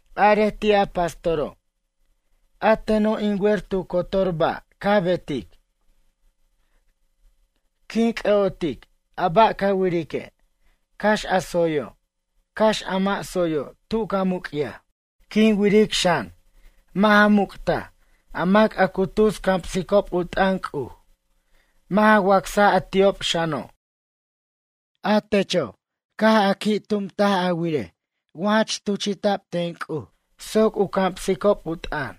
Arej ti' a pastoro': A teno' in wer tu cotor ba' ca betic. Quin c'ʌ'otic a ba' ca wirique', cax a tsoyo', cax a mʌ' tsoyo' tu ca muc'yaj. Quin wiric xan, mʌ' ja muc'taj a mac a cu tus camsicob u t'ʌn C'uj, mʌ' ja wacsaj a ti'ob xano'. A techo', caj a qui' tumt a wirej wa jach tuchi'ta'b ten C'uj soc u camsicob u t'ʌn.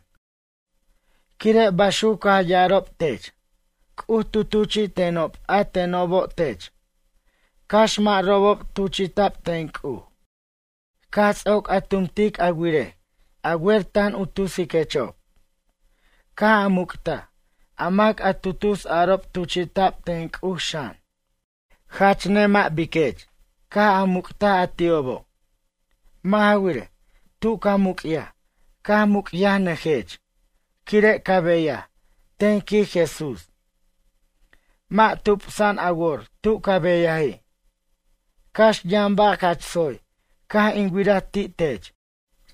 Quire', baxuc caj ya'arob tech: C'uj tu tuchi'tenob a tenobo' tech, cax mʌ' robob tuchi'ta'b ten C'uj. Caj ts'oc a tumtic a wirej a wer tan u tusiquechob. Caj a muc'taj a mac a tu tus arob tuchi'ta'b ten C'uj xan. Jach nemʌ' biquech caj a muc'taj a ti'obo'. Mʌ' ja wirej, tu ca muc'yaj caj muc'yajnʌjech, quire' ca beyaj, ten quij Jesús, mʌ' tupsa'an a wor tu ca beyaji'. Cax yʌn ba' jach tsoy caj in wiraj ti' tech,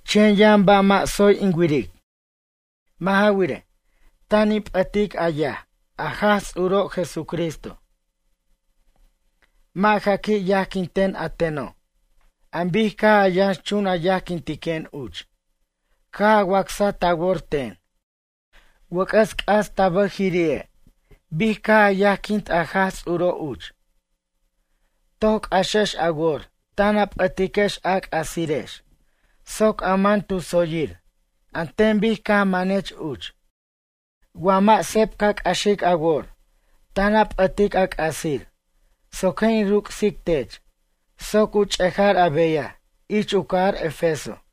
chen yʌn ba' mʌ' tsoy in wiric. Mʌ' ja wirej, tan a p'ʌtic a yaj, a Jaj Ts'uro' Jesucristo. Mʌ' ja qui' yajquinten a teno' an bic caj a yʌnxchun a yajquintiquen uch, caj a wacsaj ta wor ten. Wʌc'ʌs c'as ta bʌjiri'e', bic caj a yajquint a Jaj Ts'uro' uch. Toc c'axej a wor tan a p'ʌtiquex a c'asirex soc a man tu tsoy an ten bic caj manech uch. Wa mʌ' seb ca c'axic a wor, tan a p'ʌtic a c'asir soc je' in ruc'sic tech soc u ch'ejar a beyaj ich u cajar Efeso.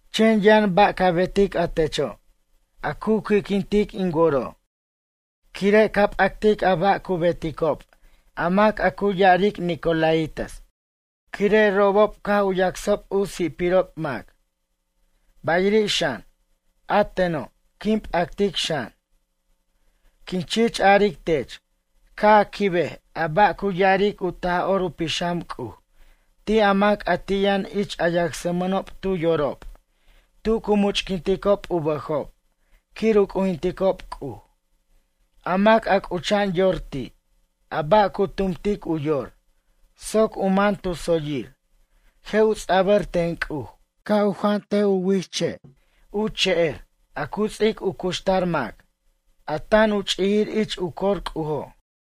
Chen yʌn ba' ca betic a techo', a cu qui'quintic in woro', quire' ca p'actic a ba' cu beticob a mac a cu ya'aric nicolaítas, quire' robob caj u yacsob u si'pirob mac. Bayiri' xan, a teno' quin p'actic xan. Quin chich aric tech, ca' a quibej a ba' cu ya'aric u Taj'or u Pixam C'uj ti' a mac a ti' yʌn ich a yacsmʌnob tu yorob tu cu much'quinticob u bʌjob quir u c'ujinticob C'uj. A mac a c'ucha'an yor ti' a ba' cu tumtic u yor, soc u man tu tsoyir je' u ts'abʌr ten C'uj ca' u jant u wich che' u che'er, a cu ts'ic u cuxtar mac, a tan u ch'ijir ich u cor C'ujo'.”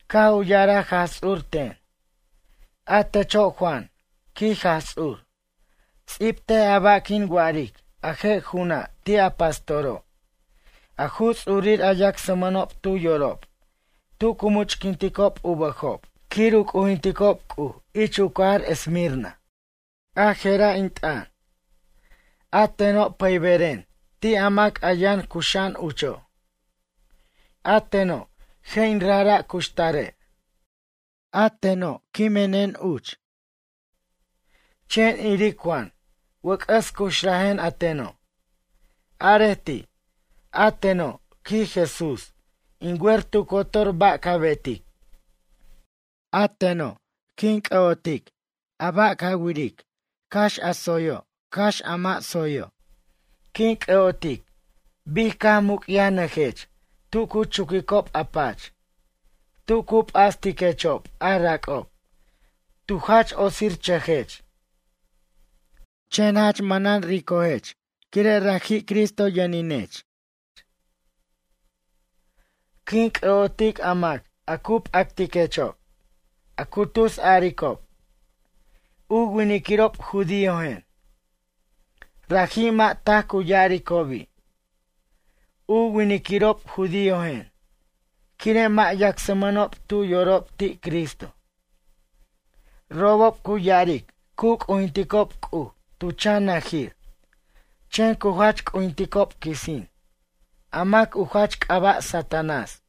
Caj u ya'araj Jaj Ts'ur ten: ―A techo' Juan ―quij Jaj Ts'ur―, ts'ibtej a ba' quin wa'aric a je' ju'una' ti' a pastoro', a ju ts'urir a yacsmʌnob tu yorob, tu cu much'quinticob u bʌjob quir u c'ujinticob C'uj ich u cajar Esmirna. A je'ra' in t'ʌn: “A teno' pʌyberen ti' a mac a yʌn cuxa'an ucho'. A teno', je' in rajra' cuxtare'. A teno' quimen uch. Chen iric Juan, wʌc'ʌs cuxrajen a teno'.” Arej ti': “A teno', quij Jesús, in wer tu cotor ba' ca betic. A teno' quin c'ʌ'otic ba' ca wiric, cax a tsoyo', cax a mʌ' tsoyo'. Quin c'ʌ'otic bic caj muc'yajnʌjech tu cu chuquicob a pach, tu cu p'astiquechob a rac'ob, tu jach otsirchʌjech. Chen jach manan ricojech quire' raji' Cristo yʌninech. Quin c'ʌ'otic a mac a cu p'actiquechob, a cu tus aricob: U winiquirob judíojen. Raji' mʌ' taj cu ya'aricobi': U winquirob judíojen, quire' mʌ' yacsmʌnob tu yorob ti' Cristo. Robob cu ya'aric cu c'ujinticob C'uj tu chan najir, chen cu jach c'ujinticob quisin, a mac u jach c'aba' Satanás.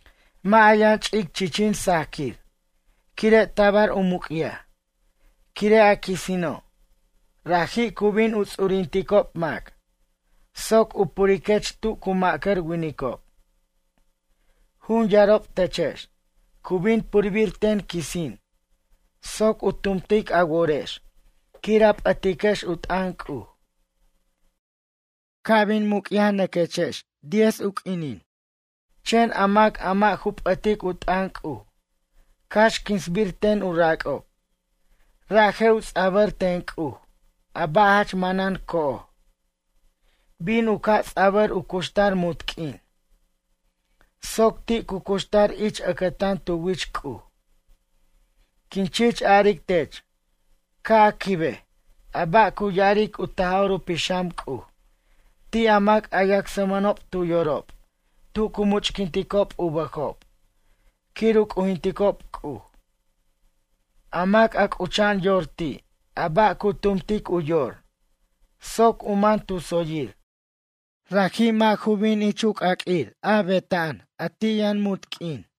Mʌ' a yʌn ch'ic chichin sajquir quire' tabar a muc'yaj, quire' a quisino', raji' cu bin u ts'urinticob mac soc u puriquech tu cu ma'cʌr winicob. Jun yarob techex, cu bin purbir ten quisin soc u tumtic a worex quir a p'ʌtiquex u t'ʌn C'uj. Ca' bin muc'yajnʌquex diez u q'uinin, chen a mac a mʌ' ju p'ʌtic u t'ʌn C'uj, cax quinsbir ten u rac'ob, ra' je' u ts'abʌr ten C'uj a ba' jach manan co'oj, bin u ca' ts'abʌr u cuxtar munt q'uin, soc ti' cu cuxtar ich ʌcʌtan tu wich C'uj. Quin chich aric tech ca' a quibej a ba' cu ya'aric u Taj'or u Pixam C'uj ti' a mac a yacsmʌnob tu yorob tu cu much'quinticob u bʌjob quir u c'ujinticob C'uj. A mac a c'ucha'an yor ti' a ba' cu tumtic u yor, soc u man tu tsoyir, raji' mʌ' ju bin ich u c'aq'uir betnaj a ti' yʌn munt q'uin.”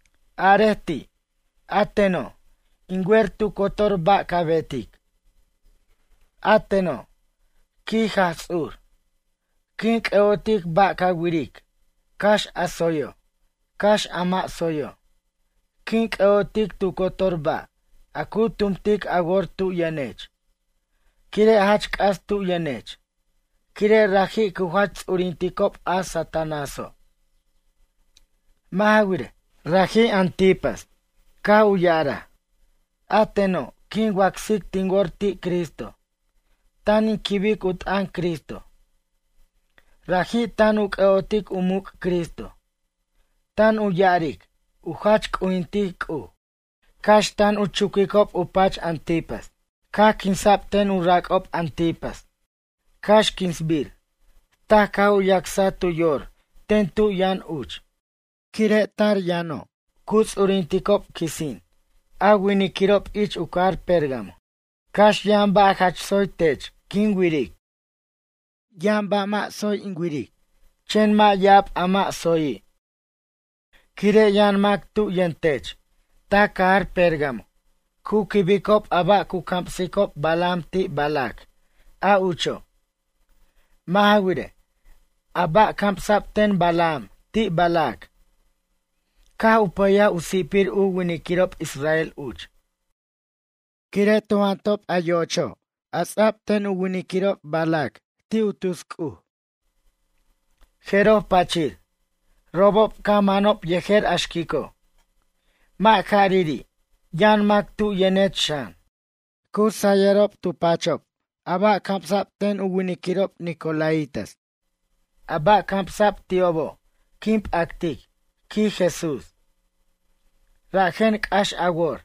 Arej ti': “A teno', in wer tu cotor ba' ca betic. A teno', quij Jaj Ts'ur, quin c'ʌ'otic ba' ca wiric, cax a tsoyo', cax a mʌ' tsoyo'. Quin c'ʌ'otic tu cotor ba' a cu tumtic a wor tu yʌnech, quire' jach c'as tu yʌnech quire' raji' cu jach ts'urinticob a Satanáso'. Mʌ' ja wirej, raji' Antipas, caj u ya'araj: A teno' quin wacsic tin wor ti' Cristo, tan in quibic u t'ʌn Cristo. Raji' tan u c'ʌ'otic u muc' Cristo, tan u ya'aric u jach c'ujintic C'uj, cax tan u chuquicob u pach Antipas. Caj quinsa'b ten u rac'ob Antipas, cax quinsbir, taj caj u yacsaj tu yor ten tu yʌn uch. Quire' tar yʌno' cu ts'urinticob quisin a winquirob ich u cajar Pérgamo. Cax yʌn ba' jach tsoy tech quin wiric. Yʌn ba' mʌ' tsoy in wiric, chen mʌ' ya'ab a mʌ' tsoyi'. Quire' yʌn mac tu yʌntech ta cajar Pérgamo cu quibicob a ba' cu camsic Balaam ti' Balac a ucho'. Mʌ' ja wirej, a ba' camsa'b ten Balaam ti' Balac caj u pʌyaj u si'pir u winquirob israel uch. Quire' tu jantob a yo'ocho' a ts'a'b ten u winquirob Balac ti' u tus c'uj, jeroj pachir, robob caj manob yejer a xquico'. Mʌ' jariri', yʌn mac tu yʌnech xan, cu sayʌrob tu pachob a ba' camsa'b ten u winquirob nicolaítas. A ba' camsa'b ti'obo' quin p'actic, quij Jesús. Rajen c'ax a wor,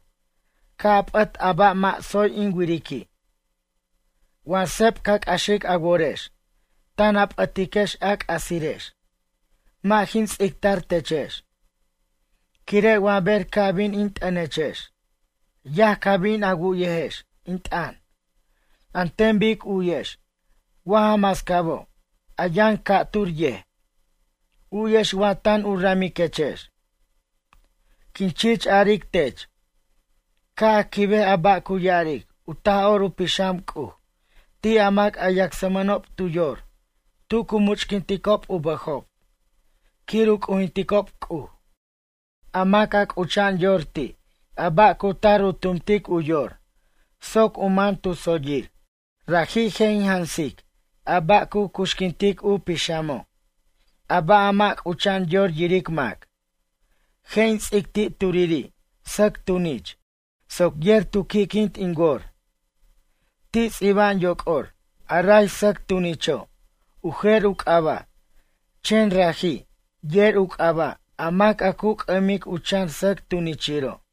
ca' a p'ʌt a ba' mʌ' tsoy in wiriqui'. Wa seb ca c'axic a worex, tan a p'ʌtiquex a c'asirex mʌ' jin ts'ictar techex. Quire' wa ber ca' bin in t'ʌnechex, yaj ca bin a wu'yejex in t'ʌn, an ten bic u'yex wa ja mascabo', a yʌn ca'tur yej, u'yex wa tan u ramiquechex. Quin chich aric tech, ca' a quibej a ba' cu ya'aric u Taj'or u Pixam C'uj ti' a mac a yacsmʌnob tu yor tu cu much'quinticob u bʌjob quir u c'ujinticob C'uj. A mac a c'ucha'an yor ti' a ba' cu tar u tumtic u yor soc u man tu tsoyir, raji' je' in jansic a ba' cu cuxquintic u pixamo', a ba' a mʌ' c'ucha'an yor yiric mac. Je' in ts'ic ti' turiri' sʌc tunich, soc yer tu qui'quint in wor. Ti' ts'iba'an yoc'or a ray sʌc tunicho' u jer u c'aba', chen raji' yer u c'aba' a mac a cu c'ʌmic u chan sʌc tunichiro'.”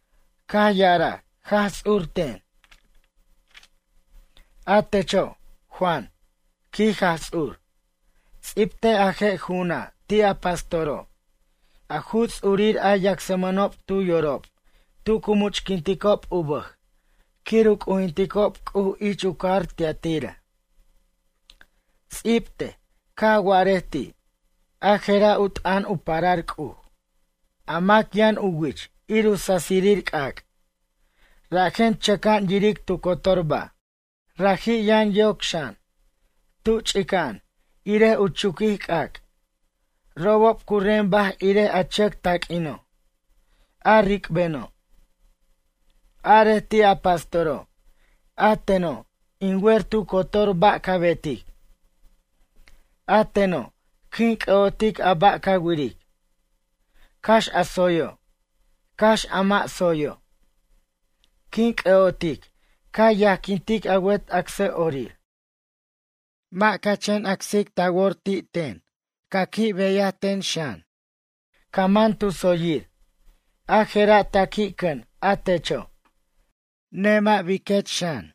Caj ya'araj Jaj Ts'ur ten: ―A techo', Juan ―quij Jaj Ts'ur―, ts'ibtej a je' ju'una' ti' a pastoro', a ju ts'urir a yacsmʌnob tu yorob tu cu much'quinticob u bʌj quir u c'ujinticob C'uj ich u cajar Tiatira. Ts'ibtej, ca' a wa'arej ti': “A je'ra' u t'ʌn u parar C'uj, a mac yʌn u wich ir u sasirir c'ac', rajen chʌca'an yiric tu cotor ba'. Raji' yʌn yoc xan, tu ch'ica'an irej u chuquij c'ac', robob cu rembaj irej a chʌc taq'uino', a ric'beno'.” Arej ti' a pastoro': “A teno', in wer tu cotor ba' ca betic. A teno', quin c'ʌ'otic a ba' ca wiric, cax a tsoyo', cax a mʌ' tsoyo'. Quin c'ʌ'otic ca yajquintic a wet acsʌ'orir. Mʌ' ca chen wacsic ta wor ti' ten, ca qui' beyaj ten xan. Ca man tu tsoyir, a je'ra' ta qui' cʌn a techo'. Nemʌ' biquech xan.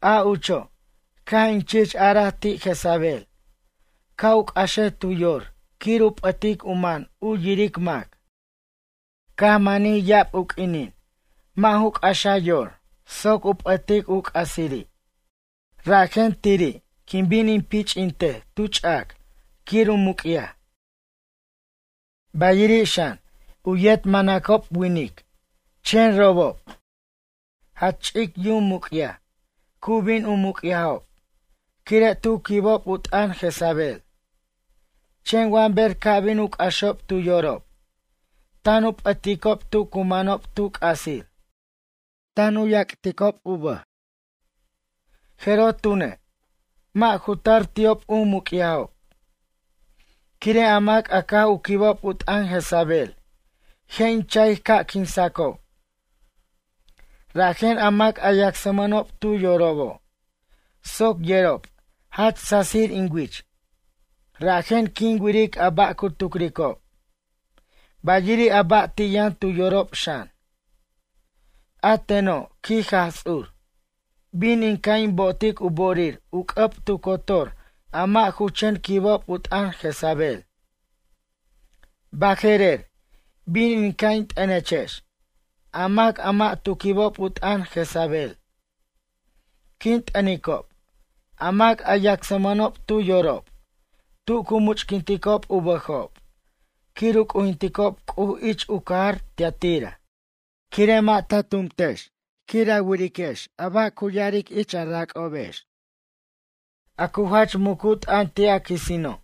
A ucho', caj in chich araj ti' Jezabel ca' u c'axej tu yor quir u p'ʌtic u man u yiric mac. Caj manij ya'ab u q'uinin mʌ' ju c'axa yor soc u p'ʌtic u c'asiri'. Rajen tiri', quin bin in pich'intej tu ch'ac quir u muc'yaj. Bayiri' xan, u yet manacob winic, chen robob, jach ch'ic yum muc'yaj cu bin u muc'yajob quire' tu quibob u t'ʌn Jezabel. Chen wa ber ca' bin u c'axob tu yorob, tan u p'ʌticob tu cu manob tu c'asir, tan u yac'tob u bʌj, jeroj tune', mʌ' ju tar ti'ob u muc'yajob. Quire' a mac a caj u quibob u t'ʌn Jezabel je' in cha'ic ca' quinsacob. Rajen a mac a yacsmʌnob tu yorobo' soc yerob jach sasir in wich rajen quin wiric a ba' cu tucricob, bayiri' a ba' ti' yʌn tu yorob xan. A teno', quij Jaj Ts'ur, bin in ca' in bo'ot u bo'orir u c'ʌb tu cotor a mʌ' ju chen quibob u t'ʌn Jezabel. Baje'rer, bin in ca' in t'ʌnechex a mac a mʌ' tu quibob u t'ʌn Jezabel. Quin t'ʌnicob a mac a yacmʌnob tu yorob tu cu much'quinticob u bʌjob quir u c'ujinticob C'uj ich u cajar Tiatira. Quire' mʌ' ta tumtex quir a wirex a ba' cu ya'aric ich a rac'obex, a cu jach mucu t'ʌn ti' a quisino',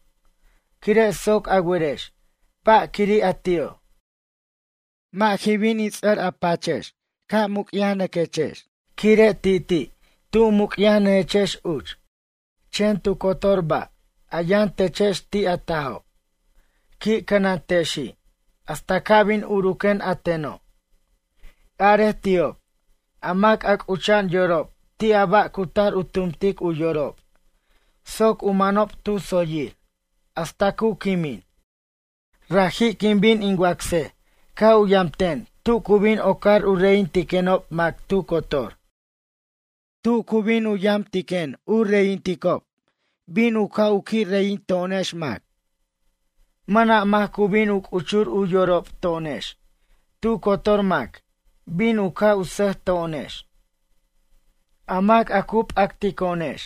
quire' soc a werex ba' quiri' a ti'o'. Mʌ' jin bin in ts'ʌr a pachex ca' muc'yajnʌquex quire' ti'ti' tu muc'yajnʌjechex uch. Chen tu cotor ba' a yʌn techex ti' a tajo', qui' cʌnantexi' hasta ca' bin uruquen a teno'. Arej ti'ob: A mac a c'ucha'an yorob ti' a ba' cu tar u tumtic u yorob soc u manob tu tsoyir hasta cu quimin, raji' quin bin in wacsej ca' u yam ten tu bin ocar u reyintiquenob mac tu cotor. Tu cu bin u yamtiquen u reyinticob, bin u ca' qui' reyinto'onex mac. Mʌna' mac cu bin u c'uchur u yorob to'onex, tu cotor mac bin u ca' u sʌjto'onex. A mac a cu p'actico'onex,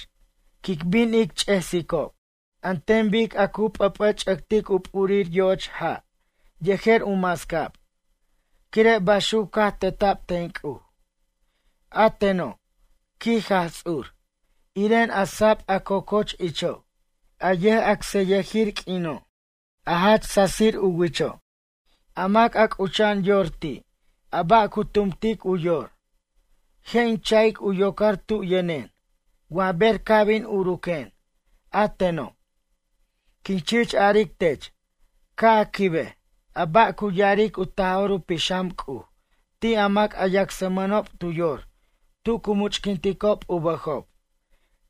quic bin ic ch'esicob an ten bic a cu p'ʌp'ʌch'ʌtic u p'urir yo'och ja' yejer u mascab, quire' baxuc caj teta'b ten C'uj. A teno', quij Jaj Ts'ur, iren a sab a cococh icho', a yʌj'acsʌyʌjir q'uino', a jach sasir u wicho'. A mac a c'ucha'an yor ti' a ba' cu tumtic u yor, je' in cha'ic u yocar tu yʌnen wa ber ca' bin uruquen a teno'. Quin chich aric tech ca' a quibej a ba' cu ya'aric u Taj'or u Pixam C'uj ti' a mac a yacsmʌnob tu yor tu cu much'quinticob u bʌjob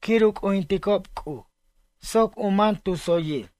quir u c'ujinticob C'uj, soc u man tu tsoyir.”